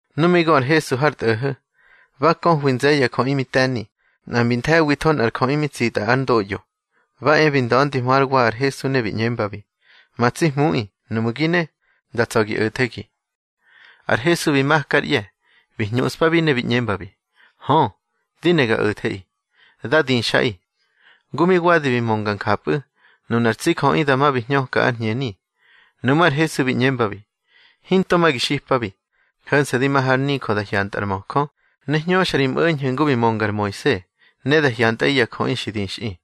Nu mi gö ar Hesu har tꞌo̱ho̱, ba köhwi nze̱ye̱ ya jöꞌi mi te̱ni. Nꞌa mbi nthe̱witho nꞌar jöꞌi mi tsitꞌa ár ndoꞌyo, ba e bi nda̱ndihmö hár wa ar Hesu ne bi ꞌñembabi: —Ma tsi Hmuꞌi, nuꞌmu̱ gi ne, da tsa̱ gi o̱thegi. Ar Hesu bi maka ár ꞌye̱, bi hñuꞌspabi ne bi ꞌñembi: —Hö, di ne ga o̱theꞌi. Dá dixꞌaꞌi. Ngu mi wadi bi mönga njapꞌu̱, nunar tsi jöꞌi dama bi hñöka ár hñeni. Nuꞌmú̱ ar Hesu bi ꞌñembabi: —Hinto ma gi xipabi, ho̱nse̱ di ma har nijö da hyantꞌa ar möjö, ne hñöxa ri mꞌo̱ñho̱ ngu bi mönga ar Moise, ne da hyantꞌaꞌi ya jöꞌi xi dixꞌi.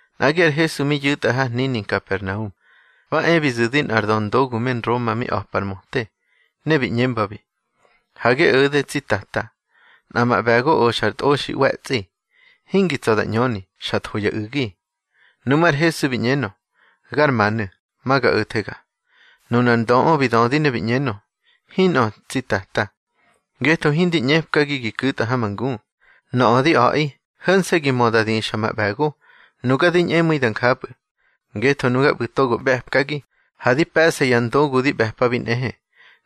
Nꞌagi ar Hesu mi yu̱tꞌa har hnini Nkapernaum, ba e bi zu̱di nꞌar döndogu me Nroma, mi a̱pa ar möte. Ne bi ꞌñembabi: —Ha gi o̱de, tsi Tata. Nꞌa ma ꞌbe̱go oxa ar tꞌoxi ꞌwe̱tsꞌi, hingi tsa̱ da ꞌñöni, xa tho ya u̱gi. Nuꞌmú̱ ar Hesu bi ꞌñenö: —Gar manu̱, ma ga o̱thega. Nunar ndöꞌö bi dödi ne bi ꞌñenö: —Hinꞌö, tsi Tata, ngetho hindi ꞌñepkagi gi ku̱tꞌa ha ma ngu. Nöꞌö di a̱ꞌi, ho̱nse̱ gi mö da dixa ma ꞌbe̱go, nuga di ñꞌemu̱i da njapꞌu̱. Ngetho nuga ꞌbu̱ togo ꞌbe̱pkagi, ha di pe̱ꞌsa ya ndogu di ꞌbe̱pabi nꞌehe.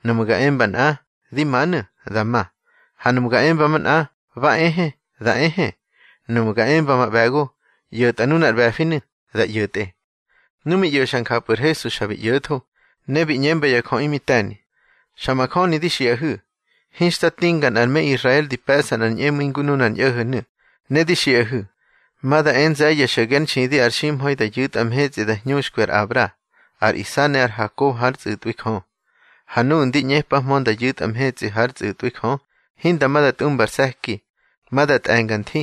Nuꞌmu̱ ga emba nꞌa, di manu̱, da ma. Ha nuꞌmu̱ ga emba manꞌa, ba ehe, da ehe. Nuꞌmu̱ ga emba ma ꞌbe̱go: ꞌYo̱tꞌa nunar ꞌbe̱finu̱, da ꞌyo̱tꞌe. Nu mi ꞌyo̱xa njapꞌu̱ ar Hesu xa bi ꞌyo̱tho, ne bi ꞌñemba ya jöꞌi mi te̱ni: —Xa majöni di xiꞌahu̱, hinxta tinga nꞌar me Israel di pe̱ꞌsa nꞌar ñꞌemu̱i ngu nunar ñꞌo̱ho̱nu̱. Ne di xiꞌahu̱, ma da e nze̱ye̱ xo̱ge ár nxidi ar ximha̱i da yu̱tꞌa mhetsꞌi da hñuxkwi ar Abra, ar Isa ne ar Hakob hár tsꞌu̱tꞌwi Jö. Ha nuꞌu̱ ndi ꞌñepahmö nda ꞌyu̱tꞌa mhetsꞌi hár tsꞌu̱tꞌwi Jö, hinda ma da tꞌumba ar se̱ki. Ma da tꞌe̱nga nthi,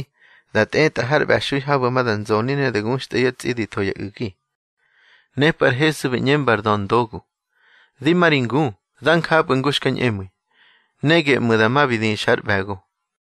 da tꞌetꞌa har ꞌbe̱xui habu̱ ma da nzoni ne da guxtꞌa yá tsꞌi di tho ya u̱gi. Nepꞌu̱ ar Hesu bi ꞌñemba ar döndogu: —Di ma ri ngu, da njapꞌu̱ ngu xka ñꞌemu̱i. Ne geꞌmu̱ dama bi dixa ár ꞌbe̱go.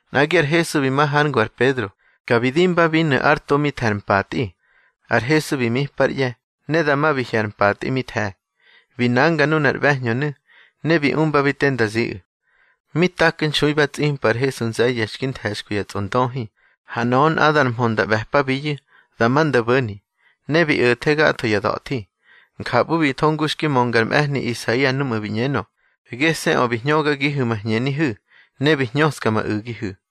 Nꞌagi ar Hesu bi ma hár ngu ar Pedro, ka bi dinbabinu̱ ár to mi the̱ ar mpatꞌi. Ar Hesu bi mipa ár ꞌye̱, ne dama bi hye̱ ar mpatꞌi mi the̱. Bi nanga nunar ꞌbe̱hñönu̱, ne bi umbabi te nda ziꞌu̱. Mi taknxui ba tsꞌimpa ar Hesu nze̱ye̱ xki nthe̱xkwi ya tsꞌondöhi, ha nöꞌö nꞌadar mhö nda ꞌbe̱pabiyu̱, dama nda bo̱ni, ne bi o̱the gatho ya da̱thi. Njapꞌu̱ bi tho ngu xki mönga ar mꞌe̱hni Isaia núꞌmu̱ bi ꞌñenö: Gese̱ꞌö bi hñögagihu̱ ma hñenihu̱, ne bi hñöska ma u̱gihu̱.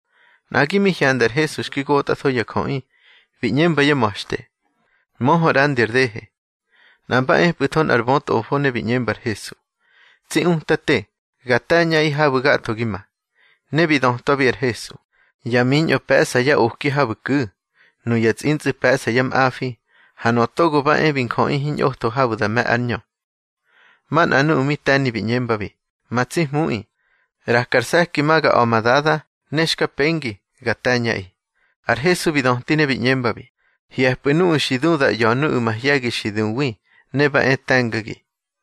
Nꞌagi mi hyanda ar Hesu xki gotꞌatho ya jöꞌi, bi ꞌñemba yá ma̱xte: —Möhö ꞌrandi ar dehe. Nꞌa mba epꞌu̱tho nꞌar bötꞌofo, ne bi ꞌñemba ar Hesu: —Tsi Utate, ga te̱ñꞌaꞌi habu̱ gatho gi ma. Ne bi dötwabi ar Hesu: —Ya miñꞌo pe̱ꞌsa yá oki habu̱ ku̱, nuya tsꞌintsꞌu̱ pe̱ꞌsa yá mꞌafi, ha Nöꞌö Togo ba e bi Njöꞌi hiñꞌotho habu̱ da me̱ ár ñö. Manꞌa nuꞌu̱ mi te̱ni bi ꞌñembabi: —Ma tsi Hmuꞌi, ꞌraka ar se̱ki ma ga a̱ ma dada, ne xka pengi, ga te̱ñꞌaꞌi. Ar Hesu bi döti ne bi ꞌñembabi: —Hye̱pꞌu̱ nuꞌu̱ xi du da ꞌya̱ nuꞌu̱ mahye̱gi xi duwi, ne ba e te̱ngagi.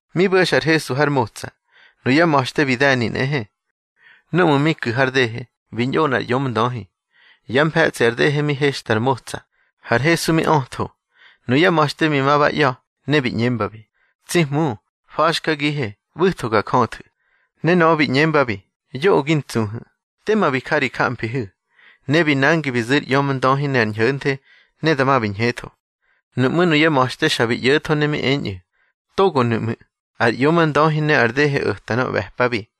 Mi bo̱xa ar Hesu har motsa, nuyá ma̱xte bi de̱ni nꞌehe. Núꞌmu̱ mi ku̱ har dehe, bi ñꞌo nꞌar ꞌyomndöhi. Yá mfe̱tsꞌi ar dehe mi hexta ar motsa, har Hesu mi ötho. Nuyá ma̱xte bi ma ba ꞌya̱, ne bi ꞌñembabi: —Tsi Hmu, fa̱xkagihe, ꞌbu̱tho ga jöthu̱. Ne nöꞌö bi ꞌñembabi: —Yoꞌö gi ntsuhu̱. Tema bi ja ri jamfihu̱. Ne bi nangi bi zu̱ ar ꞌyomndöhi ne ar ñho̱nthe, ne dama bi ñhetho. Nuꞌmú̱ nuyá ma̱xte xa bi ꞌyo̱tho ne mi eñꞌu̱: —Togonu̱ ꞌmu̱, ar ꞌyomndöhi ne ar dehe o̱ta nöꞌö ꞌbe̱pabi.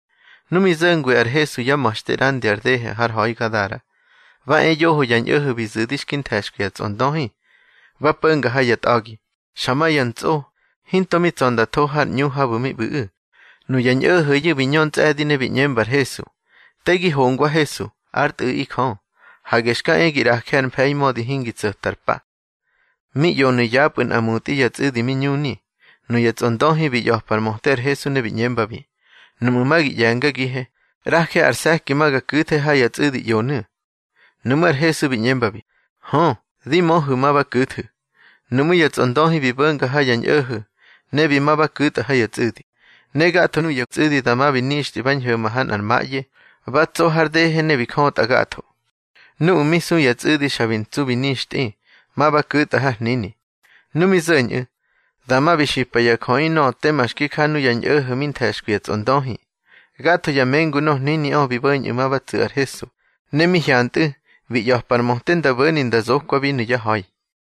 Nu mi zo̱ngwi ar Hesu yá ma̱xte ꞌrandi ar dehe har ha̱i Gadara, ba e yoho ya ñꞌo̱ho̱ bi zu̱di xki nthe̱xkwi ya tsꞌondöhi, ba po̱nga ha ya tꞌa̱gi, xa ma ya ntsꞌo, hinto mi tsa̱ nda tho har ꞌñu habu̱ mi ꞌbu̱ꞌu̱. Nuya ñꞌo̱ho̱yu̱ bi ñö ntsꞌe̱di ne bi ꞌñemba ar Hesu: —Te gi hongwa Hesu, ár Tꞌu̱ꞌi Jö. Hage xka e gi ꞌraje ar mfe̱i mödi hingi tso̱ta ar pa. Mi ꞌyonu̱ yapꞌu̱ nꞌa mutꞌi ya tsꞌu̱di mi ñuni. Nuya tsꞌondöhi bi ꞌya̱pa ar möte ar Hesu ne bi ꞌñembabi: —Nuꞌmu̱ ma gi ꞌye̱ngagihe, ꞌraje ar se̱ki ma ga ku̱the ha ya tsꞌu̱di ꞌyonu̱. Nuꞌmú̱ ar Hesu bi ꞌñembabi: —Hö, di möhu̱ ma ba ku̱thu̱. Nuꞌmú̱ ya tsꞌondöhi bi bo̱nga ha ya ñꞌo̱ho̱, ne bi ma ba ku̱tꞌa ha ya tsꞌu̱di. Ne gatho nuya tsꞌu̱di dama bi nixtꞌi ba ñho̱ma ha nꞌar maꞌye, ba tso har dehe ne bi jötꞌa gatho. Nuꞌu̱ mi su ya tsꞌu̱di xa bi ntsu bi nixtꞌi, ma ba ku̱tꞌa har hnini. Nu mi zo̱ñꞌu̱, dama bi xipa ya jöꞌi nöꞌö tema xki ja nuya ñꞌo̱ho̱ mi nthe̱xkwi ya tsꞌondöhi. Gatho ya mengu nor hniniꞌö bi bo̱ñꞌu̱ ma ba tsu̱ ar Hesu, ne mi hyantꞌu̱, bi ꞌya̱pa ar möte nda bo̱ni nda zokwabinu̱ yá ha̱i.